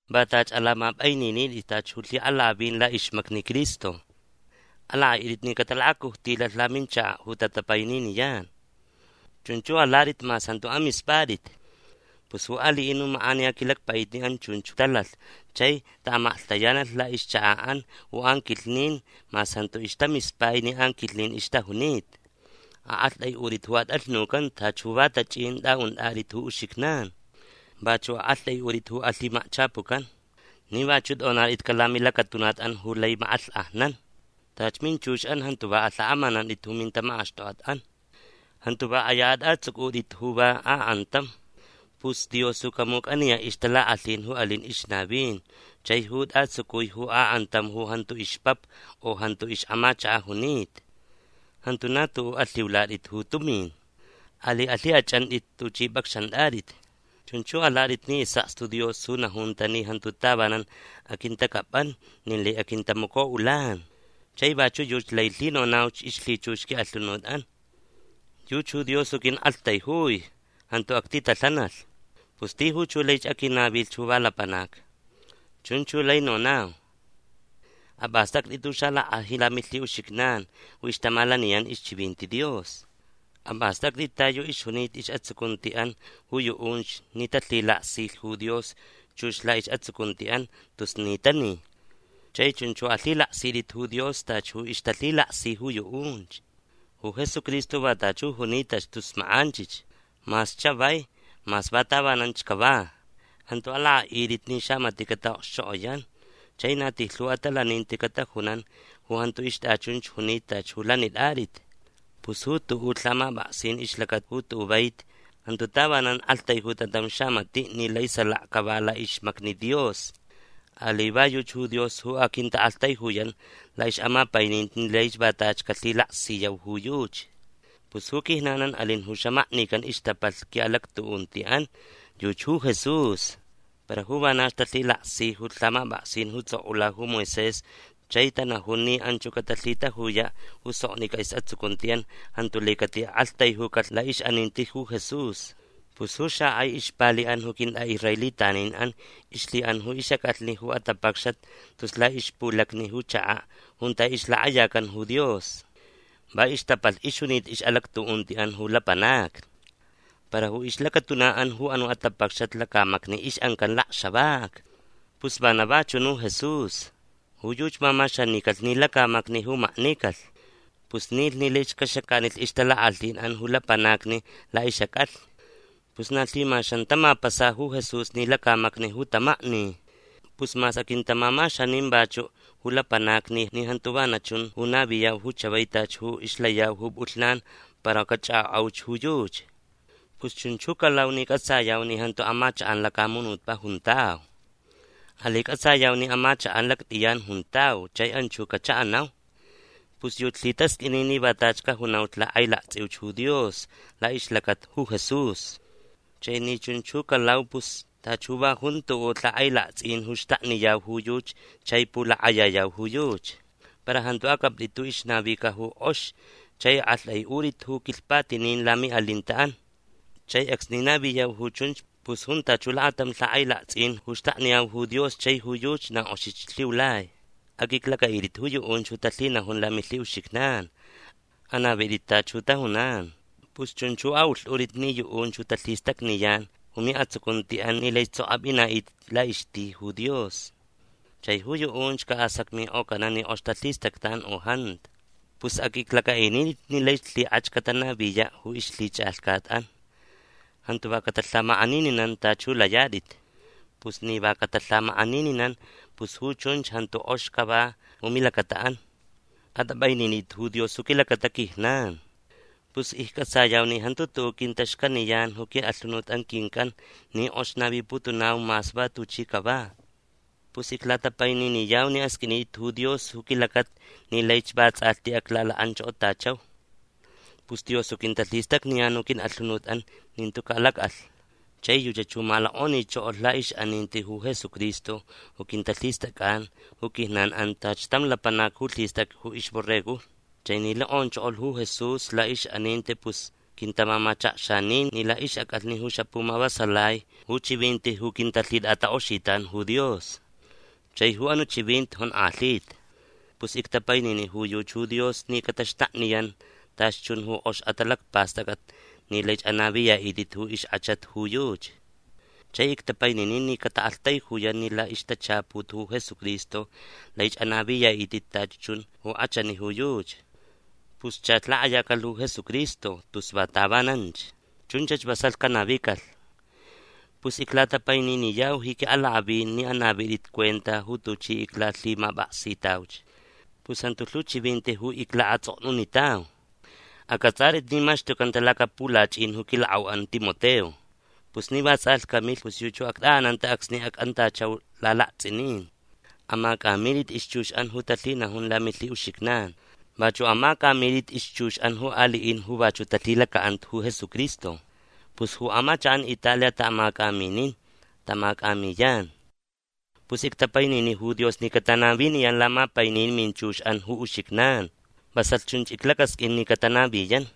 Va tachi alamapʼaininitʼit tachi ju lhiʼalakʼavin laʼixmacni Cristo. Alakʼaʼitʼit ni catalakacujtilalh laminchakaʼ ju tatapaininiyan. Chunch ju alatʼit mas jantu amispʼatʼit. Pus ju aliʼin ju makʼaniya quilacpaʼitniʼan chunch talalh chai taʼamaklhtayanalh laʼixchakaʼan ju anquilhnin mas jantu ixtamispai ni anquilhnin ixtajunita. Aʼaktʼaiʼutʼit ju atʼalhnucanta tachi ju va tachʼin tʼaʼuntʼatʼit ju uxijnan. Vachuʼ aʼaktʼaiʼutʼit ju alhimakchapucan ni vachuʼ tʼonatʼitcaʼ lamilacatunaʼan ju lai makʼalhkʼajnan. Tachi minchuxʼan jantu va alhakʼamanantʼit ju mintamakʼaxtokʼatʼan. Jantu va kʼaya atʼatsʼucʼutʼit ju va akʼantam. Pus Dios ju camucʼaniyaʼ ixtalakʼalhin ju alin ixnavin chai ju tʼatsucui ju akʼantam ju jantu ixpapa u ju jantu ixʼamachakaʼ junita. Jantu na tuʼuʼ alhiulatʼit ju tumin. Alai alhikʼachʼantʼit tuchʼi pʼacxantʼatʼit. Chunch ju alatʼit ni isʼakstu Dios ju najunta ni jantu tavanan aquintacʼapʼan nin lai aquintamacoʼulan. Chai vachuʼ yuchi lai lhinonauch ixlhichux quiʼalhunutʼan: Yuchi ju Dios ju quiʼaktaijui. Jantu actitalhanalh. Pus tijuch ju lai aquinavilh ju va lapanac. Chunch ju lai nonau. Apʼastʼactʼit ju xalackʼajin lamilhiʼuxijnan ju ixtamalaniyan ixchivinti Dios. Apʼastʼactʼit ta yu ixjunita isʼatsucuntiʼan ju yuʼunch ni talhilaksilh ju Dios chux laʼisʼatsucuntiʼan tus ni tani. Chai chunch ju alhilaksitʼit ju Dios tachi ju ixtalhilaksi ju yuʼunch. Ju Jesucristo va tachi ju junitach tus makʼanchich. Mas chavai. Mas va tavananch cava. Jantu alakʼaʼitʼit ni xamatiʼ cataʼokxchokʼoyan chai na tijlhu atalaninti catajunan ju jantu ixtʼachunch junita tachi ju lanitʼatʼit. Pus ju tuʼuʼ lhamapʼaksin ixlacata ju tuʼuʼ vaiti jantu tavanan aktaijuta tam xamatiʼ ni lai salaka cava laʼixmacni Dios. Alai va yuchi ju Dios ju aquintaʼaktaijuyan laʼixʼamapaininti ni lai va tachi calhilaksiyau ju yuchi. Pus ju quijnanʼan alin ju xamaknican ixtapalh quiʼalactuʼuntiʼan. Yuchi ju Jesús. Para ju vanach talhilaksi ju lhamapʼaksin ju tsʼokʼula ju Moisés chai tanajun ni anch ju catalhitajuyaʼ ju soknicʼa isʼatsucuntiʼan jantu lai catiʼaʼaktaijucalh laʼixʼaninti ju Jesús. Pus ju xakʼai ixpaliʼan ju quintʼaʼisraelitaninʼan ixlhiʼan ju ixʼacʼalhni ju atapacxat tus laʼixpulacni ju chakaʼ junta ixlakʼayacan ju Dios. Va ixtapalh ixjunita ixʼalactuʼuntiʼan ju lapanacni. Para ju ixlacatunaʼan ju anuʼ atapacxat lacamacni ixʼancan lakxavaca. Pus vana va chunch ju Jesús. Ju yuchi mamaxanicalh ni lacamacni ju maknicalh. Pus nilh ni laich caxacanilh ixtalakʼalhinʼan ju lapanacni laʼixʼacʼalhni. Pus na lhimaxan tamapasa ju Jesús ni lacamacni ju tamakni. Pus mas aquintamamaxanin vachuʼ ju lapanacni ni jantu vana chun ju naviyau ju chavai tachi ju ixlayau ju pʼulhnan para cachʼakʼokʼauch ju yuchi. Pus chunch ju calau ni cʼatsayau ni jantu amachakʼan lacamunutpaʼ juntau. Alai cʼatsayau ni amachakʼan lactʼiyan juntau chai anchach ju cachaʼanau. Pus yuchi lhitasqʼuini ni va tachi cajunau lakʼailaktsʼiuch ju Dios laʼixlacata ju Jesús. Chai ni chunch ju calau pus tachi ju va jun tuʼuʼ lhakʼailaktsʼin ju xtakniyau ju yuchi chai pulakʼayayau ju yuchi. Para jantu acʼaptʼit ju ixnavica ju kʼox chai aʼaktʼaiʼutʼit ju quilhpatinin lamiʼalintaʼan. Chai acsni naviyau ju chunch pus jun tachi ju lakatam lhakʼailaktsʼin ju xtakniyau ju Dios chai ju yuchi na kʼoxich lhiulai. Aqʼuiclacʼaʼitʼit ju yuʼunch ju talhinajun lamilhiʼuxijnan. Anavitʼit tachi ju tajunan. Pus chunch ju aʼulhtʼutʼit ni yuʼunch ju talhistacniyan ju miʼatsucuntiʼan ni laich sokch apʼinaʼitʼit laʼixti ju Dios. Chai ju yuʼunch casacmikʼocanaʼ ni kʼox talhistactan u jantu. Pus aqʼuiclacʼaʼinitʼit ni laich lhikʼach catanaviyaʼ ju ixlhichʼalhcat. Jantu va catalhamakʼanininan tachi ju layatʼit. Pus ni va catalhamakʼanininan pus ju chunch jantu kʼox cava ju milacataʼan. Atʼapʼaininitʼit ju Dios ju quilacata quijnan. Pus iccʼatsayau ni jantu tuʼuʼ quintaxcaniyan ju quiʼalhunut quincʼan ni kʼox naviputunau mas va tuchi cava. Pus iclatapaininiyau ni asqʼuinitʼit ju Dios ju quilacata ni laich vatsʼalhti aclalakʼanchokotachau. Pus Dios ju quintalhistacniyan ju quiʼalhunutʼan ni jantu calacʼalh. Chai yuchach ju malokʼonichokolh laʼixʼaninti ju Jesucristo ju quintalhistʼacʼan ju quijnanʼan tachi tam lapanac ju lhistʼacʼa ju ixborregojni. Chai ni lokʼonchokolh ju Jesús laʼixʼaninti pus quintamamachakxanin ni laʼixʼacʼalhni ju xapumavasalai ju chivinti ju quintalhitʼatakʼoxitan ju Dios. Chai ju anuʼ chivinti jonkʼalhita. Pus ictapainini ju yuchi ju Dios ni cataxtakniyan tachi chun ju kʼox atalacpastʼacʼat ni laich anaviyaʼitʼit ju ixkʼachat ju yuchi. Chai ictapainini ni cataʼaktaijuyan ni laʼixtachaput ju Jesucristo laich anaviyaʼitʼit tachi chun ju kʼachani ju yuchi. Pus chach lakʼayacalh ju Jesucristo tus va tavananch. Chunchach vasalh canavicalh. Pus iclatapaininiyau ji quiʼalakʼavin ni anavitʼit cuenta ju tuchi iclalhimapʼaksitauch. Pus jantu lhu chivinti ju iclaʼatsʼoknunitau. Acʼatsʼatʼit ni maxtucanta lacapulachʼin ju quilakʼauʼan Timoteo. Pus ni vatsʼalhti camilh pus yuchi ju actʼaʼananta acsni acʼantachau lalaktsʼinin. Amacʼamitʼit ixchuxʼan ju talhinajun lamilhiʼuxijnanʼan. Vachuʼ amacʼamitʼit ixchuxʼan ju aliʼin ju vachuʼ talhilacaʼanta ju Jesucristo. Pus ju amachakʼan Italia taʼamacʼaminin. Tamacʼamiyan. Pus ictapainini ju Dios ni catanaviniyan lamapainin minchuxʼan ju uxijnan. Vasalh chunch iclacasqʼuin ni catanaviyan.